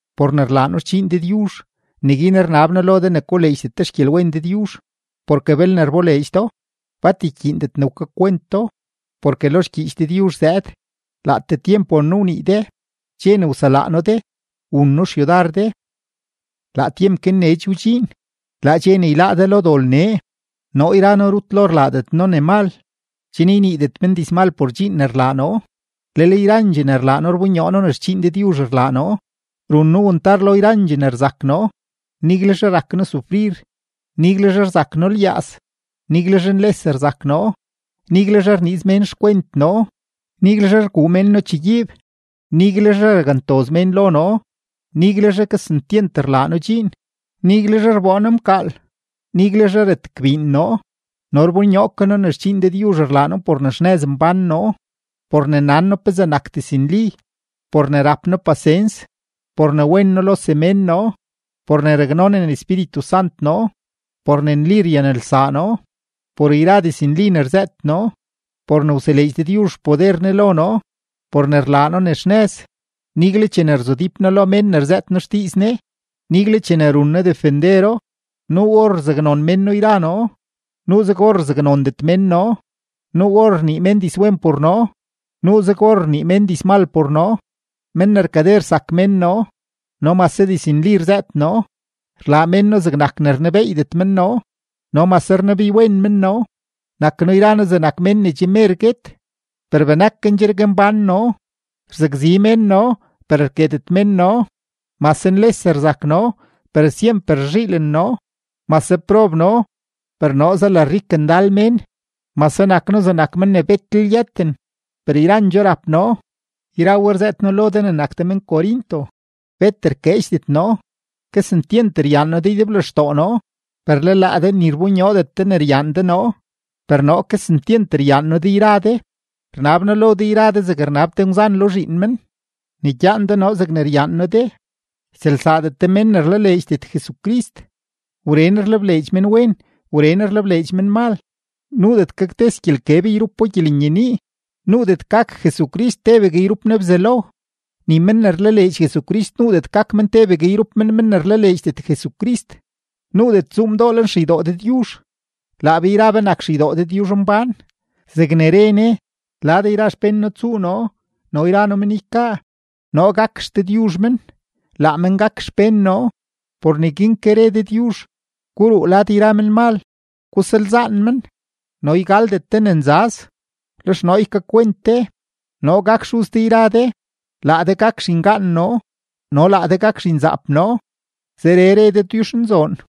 Por ne rlaa noo xdxiin Dëdyuzh, neguin rnab noo lo de ne koleedxdet de xgyelwen Dëdyuzh, porke belne rboleedx do, bat ykyiindet ne wkakwent do. Porke lo xgyiich Dëdyuzh zëëd: Laatee tyemp won noo wnii de, dxe ne wselaa noo de, wun noo xyudar de. Laa tyemp guin nee che wdxiin, laa dxe ne yláá de lo dol nee. Noo yra noo rut lo rlaadet noo ne mal, chen yniidet men dizmal por dxiin ne rlaa noo. Lel yrandxee ne rlaa noo rbonyoo noo ne xdxiin Dëdyuzh rlaa noo: run noo wantar lo yrandxee ne rzak noo, niguelzhe rak noo sufrir, niguelzhe rzak noo lyaaz, niguelzhe nles rzak noo, niguelzhe rniiz mén xkwent noo, niguelzhe rguu mén noo chegyiib, niguelzhe rakntoz mén lo noo, niguelzhe kesentyent rlaa noo dxiin, niguelzhe rboo noo mkaal, niguelzhe retgbiin noo. No rbonyoo ke noo ne xdxiin Dëdyuzh rlaa noo por ne xnëz mbán noo, por ne nan noo pezee nak diznli, por ne rap noo pasens, por ne wen noo lo semén noo, por ne raknonen Espíritu Sant noo, por ne nli ryanelsaa noo, por yra diznli ne rzëët noo, por ne wseleedx Dëdyuzh xpoder Ne lo noo, por ne rlaa noo ne xnëz, nigle chene rzudíp noo lo mén ne rzëët noo xdiiz Ne, nigle chene run noo defendero. Nuu or rzaknon mén noo yra noo, nuuzeg or rzaknondet mén noo; nuu or rnii mén dizwen por noo, nuuzeg or rnii mén dizmal por noo. Men ne rkade rsak mén noo, no mase diznli rzëët noo; rlaa mén noo zegnak ne rnebeeydet men noo, no mase rnebeywen men noo; nak noo yra noo zegnak mén ne che mer guet, per benakendxergue mbán noo; rzakzi mén noo, per rketet men noo; mase nles rzak noo, per syemper rzhiilen noo; mase prob noo, per noo zalarik ndal mén; mase nak noo zegnak men ne betlel yëten, per yrandxoo rap noo. Yra we rzëët noo lo de yra de ne nak de men-Corinto, bet rkeedxdet noo; kesentyent ryaan noo de ydeblextoo noo. Per le laa de ni rbonyoodet de ne ryaan de noo, per noo kesentyent ryaan noo de yra de. Rnab noo lo de yra de zegne rnab te ngwzan lo zhiin men, ne gyaan de noo zegne ryaan noo de. Ytsëlsaadet de men ne rlaleedxdet Jesucrist. Wren rlebleedx menwen, wren rlebleedx menmal; nuudet gaktes gyelkeb yrupo gyelenyenii. Nuudet gak Jesucrist tebegue yrup Ne Bzelo; ni men ne rlaleedx Jesucrist nuudet gak men tebegue yrup men men ne rlaleedxdet Jesucrist. Nuudet tsuu mdoo lenxeydoo Dëdyuzh. Laa be yra be nak xeydoo Dëdyuzhmbán zegne re Ne: Lad yra xpén noo tsuu noo no yra noo men ykaa, noo gak XDëdyuzh men, laa men gak xpén noo. Por neguin ke re Dëdyuzh: Guruu lad yra menmal, gusalzaan men, no ygaldet de ne nzaz. Lex noo ykakwent de. Noo gak Xuz de yra de, laa de gak zhingaan noo no laa de gak zhinzaap noo, zeree re Dëdyuzhnzoon.